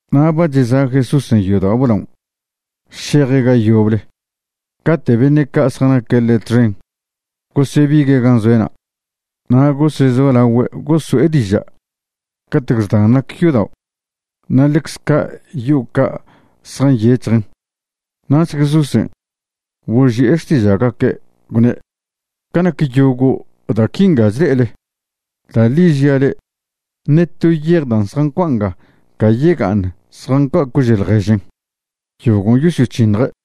Na' ba cheza' Jesúsen' yodao' blaon' šeje' ga yoble cate' beṉe' ca' zjanaque' ḻe' txen gosebigue' gan' zoe'na' na' gosezolagüe' goso'e diža' catec xdan nac yodaon' na' ḻecze ca' yo'o ca' zjanyec̱hjen. Nach Jesúsen' boži'e xtiža'gaque' gwne': ―Ca nac yogo' da' quinga chle'ele, da' ḻi žia' le'e, ṉe to yej da' zjancua' nga ca yega'aṉ zjancua' cože' ḻježen. Yogon' yosyoc̱hiṉje'.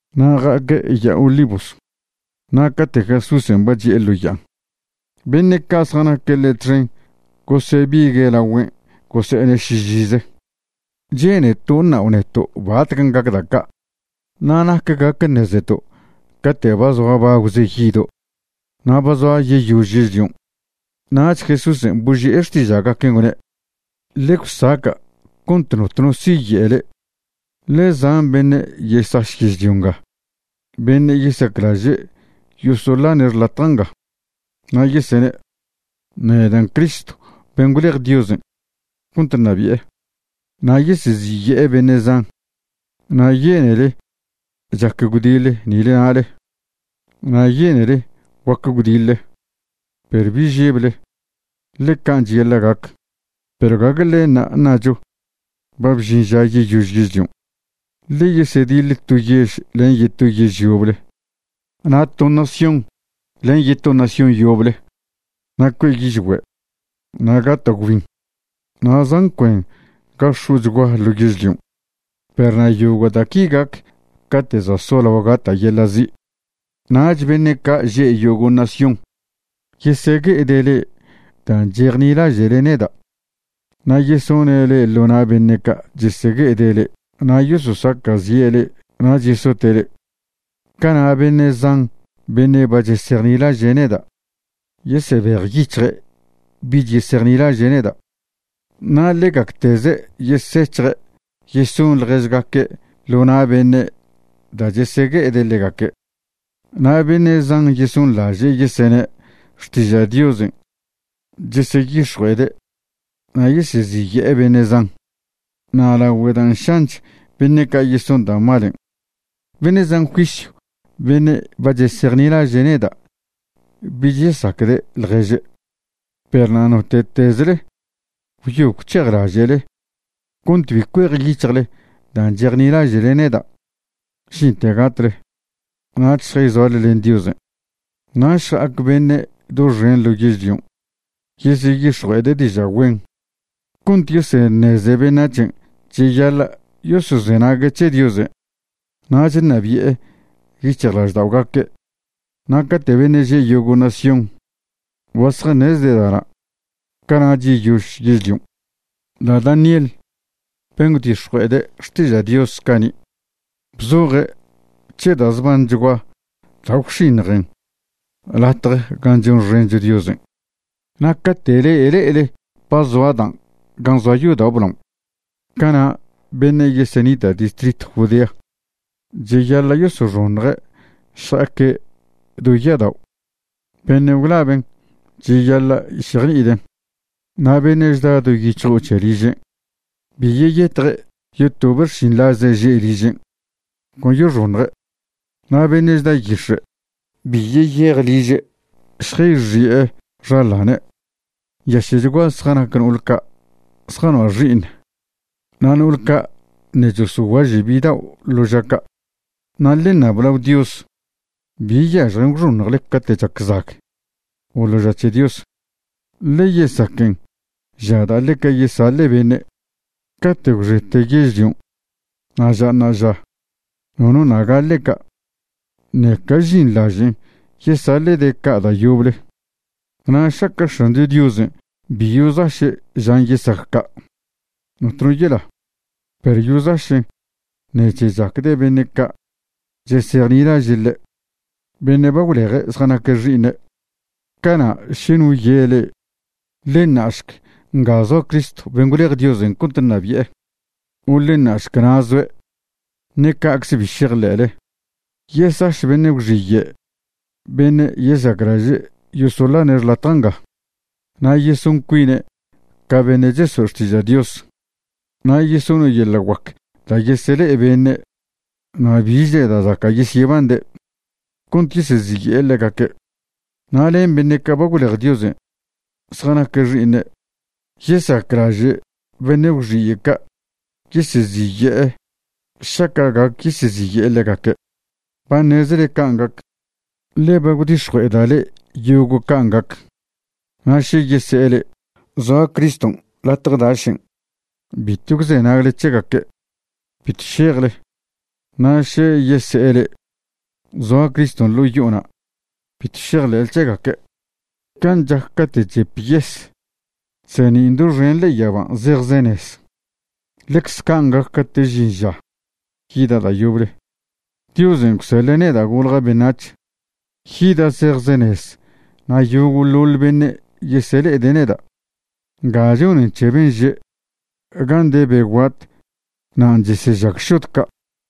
Na' ja'aque' Ya'a Olivos. Na' cate' Jesúsen' ba chi'e ḻo ya'an, beṉe' ca' zjanaque' ḻe' txen gosebigue' lagüen' gose'ene' šižize: ―Che'neto' ṉao' neto' batcan' gac da' ca'. Na' ¿nac gac ṉezeto' cate' ba zoa bagwze yido' na' ba zoa yeyož yežlion'? Nach Jesúsen' boži'e xtiža'gaquen' gwne': ―Ḻe gwsaca' cont notno siye' le'e. Ḻe zan beṉe' yesaš yežlio nga beṉe' yesaclaže' yosoḻane' xḻatja' nga. Na' yesene': “Nedan' Cristo ben' gwlej Diosen' cont ṉabi'e.” Na' yeseziye'e beṉe' zan. Na' yenele chac gwdiḻe nile nale, na' yenele guac gwdiḻe, perw bi žeble, ḻe can' cheyaḻa' gac. Perw gague ḻenṉa' ṉacho ba bžin ža yeyož yežlion'. Ḻe yesediḻ to yež len yeto yež yoble na' to nación len yeto nación yoble. Na' cue' yižgüe', na' gata' gwbin na' zan cuen ga x̱o'chgua ḻo yežlion'. Perw na' yogo' da' qui gac cate' za' solao gata' yeḻa' zi'. ’Nach beṉe' ca' že' yogo' nación yesegue'ede' le'e dan' chejnilaže'le neda' na' yesone' le'e ḻo na' beṉe' ca' chesegue'e le'e na' yososaca'zi'e le'e nach yesote' le'e. Cana' beṉe' zan beṉe' ba chesejnilaže' neda' yesebejyic̱hje' bich yesejnilaže' neda'. Na' ḻegacteze' yesec̱hje' yeson ḻježgaque' ḻo na' beṉe' da' chesegue'ede' ḻegaque'. Na' beṉe' zan yesonḻaže' yesene' xtiža' Diosen' cheseyix̱jue'ede' na' yeseziye'e beṉe' zan. Na' lagüe dan' šanch beṉe' ca' yeson da' malen', beṉe' zan juisyw beṉe' ba chesejnilaže' neda' bich yesacde' ḻježe'. Perw na' note'tezle gwyo gwc̱hejlaže'le cont bi cuejyic̱hjle dan' chejnilaže'le neda' žinten gatle, nach šjayzoale len Diosen'. Na' šja'ac beṉe' doxen ḻo yežlion' yeseyix̱jue'ede' diža' güen cont yeseṉeze beṉac̱hen' cheyaḻa' yosozenague' c̱he Diosen' nach ṉabi'e yic̱hjlažda'ogaque'. Na' cate' beṉe' že' yogo' nación ba zjaṉezde' da'na', cana'ch yeyož yežlion'. ’Da' Daniel ben' gwdix̱jue'ede' xtiža' Dios cani' bzoje' c̱he da' zbanchgua da' gwx̱iṉjen latje gan' chonxencho Diosen'. Na' cate' le'e le'ele ba zoa dan' gan' zoa yodao' blao, cana' beṉe' yesenita' distritw Judea cheyaḻa' yosoxoṉje' šja'aque' do ya'adao'. (Beṉe' gwlaben' cheyaḻa' šejni'iden'.) Na' beṉe' chda do yic̱hjo'o c̱he ližen', bi yeyetje' yotobe' xšinḻaze' že' ližen', con yoxoṉje'. Na' beṉe' chda yix̱e' bi yeyej liže' šjayxi'e xaḻane'. ¡Nyaše'chguaze zjanac no'ol ca' zjanoa' xi'iṉ na' no'ol ca' ṉe' chosoguaže' bidao' ḻo ža ca'! Na' ḻe ṉab lao Dios bi yažjen gwxoṉjle cate' chac zag o ḻo ža c̱he Dios. Ḻe yesaquen ža da' ḻeca yesaḻe' beṉe'. Cate' gwxete yežlion' na' ža ṉa'aža nono ṉa' gaḻe' ca', ṉeca žinḻažen' yesaḻe'de' ca' da' yoble. Na' šaca' X̱ancho Diosen' bi yozaše' žan' yesac ca', notno yela, perw yozašen' ṉec̱he chacde' beṉe' ca' chesejnilaže' ḻe', beṉe' ba gwleje' zjanaque' xi'iṉe'. ’Cana' še no ye' le'e: “Ḻe ṉa'šc, nga zoa Criston' ben' gwlej Diosen' cont ṉabi'e”, o “Ḻe ṉa'šc, na' zoe'”, ṉe ca'cze bi šejḻe'le. Yesaš beṉe' gwxiye' beṉe' yesaclaže' yosoḻane' xḻatja' nga, na' yeson cuine' ca beṉe' chesoe' xtiža' Dios. Na' yesone' yeḻa' guac da' yesele'e beṉe' na' bichle da' zaca' yesyebande' cont yeseziye'e ḻegaque'. Na' len beṉe' ca' ba gwlej Diosen' zjanaque' xi'iṉe' yesaclaže' beṉe' gwxiye' ca' yeseziye'e šaca' gac yeseziye'e ḻegaque'. Ba ṉezele can' gac, ḻe ba gwdix̱jue'eda' le'e yogo' can' gac. Na' še yese'e le'e: “Zoa Criston' latje dašen'”, bitw gwzenagle c̱hegaque', bitw šejle. Na' še yese'e le'e: “Zoa Criston' ḻo' yo'ona'”, bitw šejḻe'le c̱hegaque'. Can' chac cate' chep yes chseṉin' doxen ḻe'e yaban' zejzenez, ḻecze can' gac cate' žin ža yida' da' yoble, Diosen' gwseḻe' neda' golja' beṉac̱h. Yida' zejzenez na' yogo'ḻoḻ beṉe' yesele'ede' neda'. Nga chonen c̱he ben' že': “Gan' de be guat nan' chesežag šod ca'.”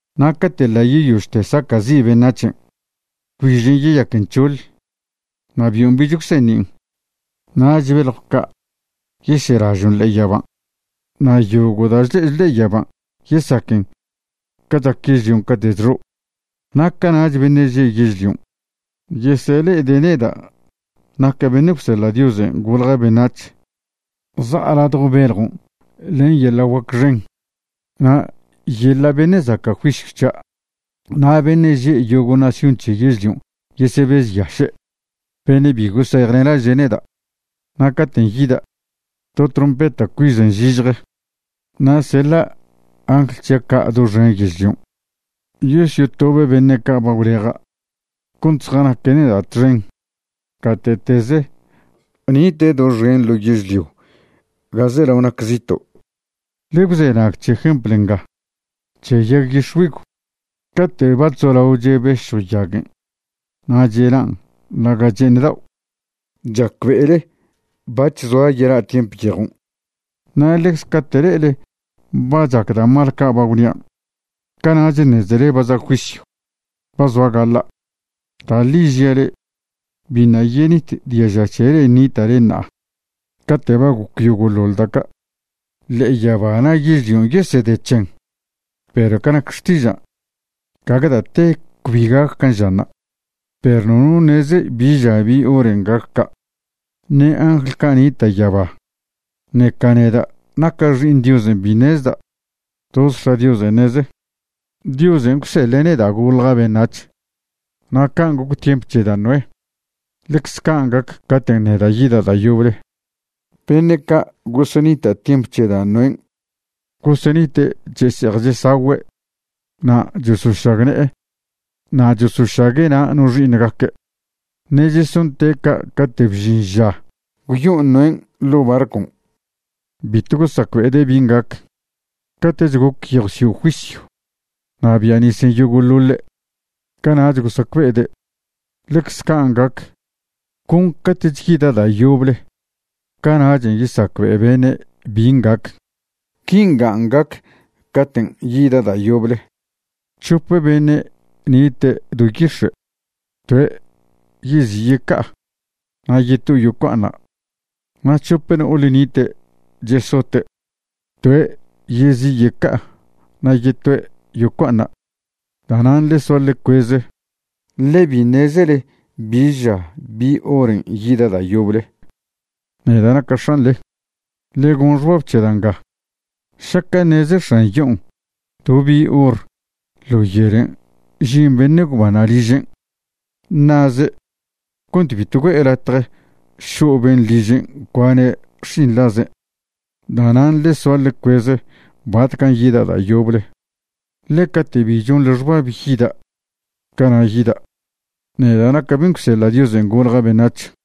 ’Na' cate' ḻa' yeyožte saca'zi' beṉac̱hen', gwbižen' yeyaquen c̱hoḻ, na' bion' bich gwseṉin'. Nach beljw ca' yeselažon' ḻe'e yaban', na' yogo' da' chle'echo ḻe'e yaban' yesaquen ca chac yežlion' cate' chxo'. Na' cana'ch beṉe' že' yežlion' yesele'ede' neda' naca' ben' gwseḻa' Diosen' golja' beṉac̱h za'a ladjo bejon' len yeḻa' guac xen na' yeḻa' beṉe' zaca' juisyw c̱hia'. Na' beṉe' že' yogo' nación c̱he yežlion' yesebežyaše', beṉe' bi gosejnilaže' neda'. Na' caten' yida', to trompeta' cuežen zižje, na' seḻa' angl c̱hia' ca' doxen yežlion' yosyotobe' beṉe' ca' ba gwleja' cont zjanaque' neda' txen gate'teze nite' doxen ḻo yežlio ga zelao nac zito'. ’Ḻe gwzenag c̱he jempl nga c̱he yag yix̱güigw: Cate' ba chzolao chebešjw yaguen' na' chelan' ḻaga' che'eṉ dao', chacbe'ele bac̱h zoa yela' tiemp yejon'. Na' ḻecze cate' le'ele ba chac da' mal ca' ba gwnian', cana'ch ṉezele ba za' juisyw, ba zoa gaḻa'. Da' ḻi žia' le'e, biṉa' yenit diaža c̱he le'e nita'le ṉa'a cate' ba goc yogo'ḻoḻ da' ca'. Ḻe'e yaba na' yežlion' yesede c̱hen, perw ca nac xtižan', gague da' te cbi gac can' žanṉa'. ’Perw nono ṉeze bi ža bi horen' gac ca', ṉe angl ca' nita' yaba, ṉeca neda' naca' Xi'iṉ Diosen' bi ṉezda'. Toz X̱a' Dios ṉeze. ’Diosen' gwseḻe' neda' golja' beṉac̱h, na' can' goc tiemp c̱he da' Noé, ḻecze can' gac caten' neda' yida' da' yoble. Beṉe' ca' gosenita' tiemp c̱he da' Noén' gosenite' chese'ej chesagüe' na' chosošagne'e na' chosošague' na' no xi'iṉgaque'. Ṉe' chesonte' ca' caten' bžin ža gwyo'o Noén' ḻo' barcon'. Bitw gosacbe'ede' bin' gac. Cate'ch goc yejw sio' juisyw na' bia' nisen' yogo'ḻoḻe' cana'ch gosacbe'ede'. Ḻecz can' gac, con cate'ch yida' da' yoble cana'chen' yesacbe'e beṉe' bin' gac. Quingan' gac caten' yida' da' yoble: C̱hope beṉe' nite' do yix̱e', toe' yezi' yeca'a, na' yetoe' yocua'aṉa'. Na' c̱hope no'ole ṉite' chesote', toe' yezi' yeca'a na' yetoe' yocua'aṉa'. ’Da'nan' ḻe soa ḻe cueze, ḻe bi ṉezele bi ža bi horen' yida' da' yoble, neda' naca' X̱anḻe. Ḻe gon xbab c̱he da' nga, šaca' ṉeze x̱an yo'on' do bi hor ḻo yelen' žin beṉe' gwbanṉa' ližen', ṉa'ze' cont bitw güe'e latje šo' ben' ližen' cuane' xšinḻazen'. Da'nan' ḻe soa ḻe cueze batcan' yida' da' yoble, ḻe cate' bi chonḻe xbab yida', cana' yida', neda' naca' ben' gwseḻa' Diosen' golja' beṉac̱h.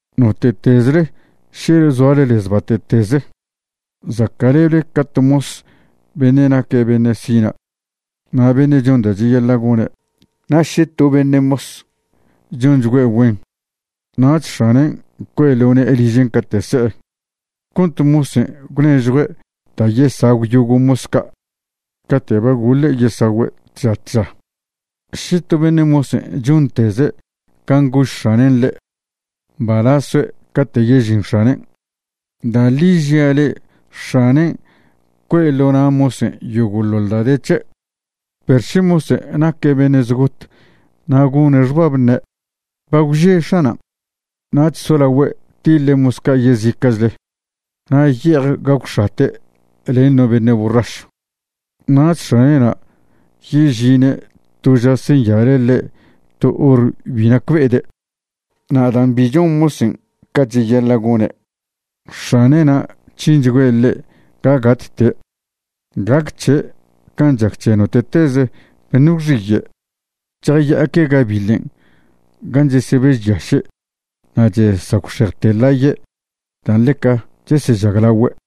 ’Note'tezle še zoale lez bate'teze, zaca'leble ca to mos beṉe' naque' beṉe' sina' na' beṉe' chon da' cheyaḻa' gone'. Na' še to beṉe' mos chonchgüe' güen, nach x̱anen' cue'e ḻo ne'e ližen' cate' se'e cont mosen' gwnežjue' da' yesagw yogo' mos ca' cate' ba goḻe' yesagüe' tža tža. Še to beṉe' mosen' chonteze' can' gož x̱anen' ḻe', mbalaz soe' cate' yežin x̱anen'. Da' ḻi žia le'e, x̱anen' cue' ḻo na' mosen' yogo'ḻoḻ da' de c̱he'. Perw še mosen' naque' beṉe' zgot na' gone' xbab ṉe': “Ba gwže x̱anan'”. Nach solagüe' tiḻe' mos ca' yezica'chle na' ye'ej gagwx̱ate' len no beṉe' borrašw, nach x̱ane'na' yežine' to ža senyale' ḻe' to hor bi nacbe'ede'. Na' dan' bi chon mosen' ca cheyaḻa' gone', x̱ane'na' c̱hinchgüe' ḻe' ca gatte'. Gac c̱he' can' chac c̱he note'teze beṉe' gwxiye', chjaya'aque' gabiḻen' gan' chesebežyaše' na' chesagwxejte ḻaye' dan' ḻeca chesežaglagüe'.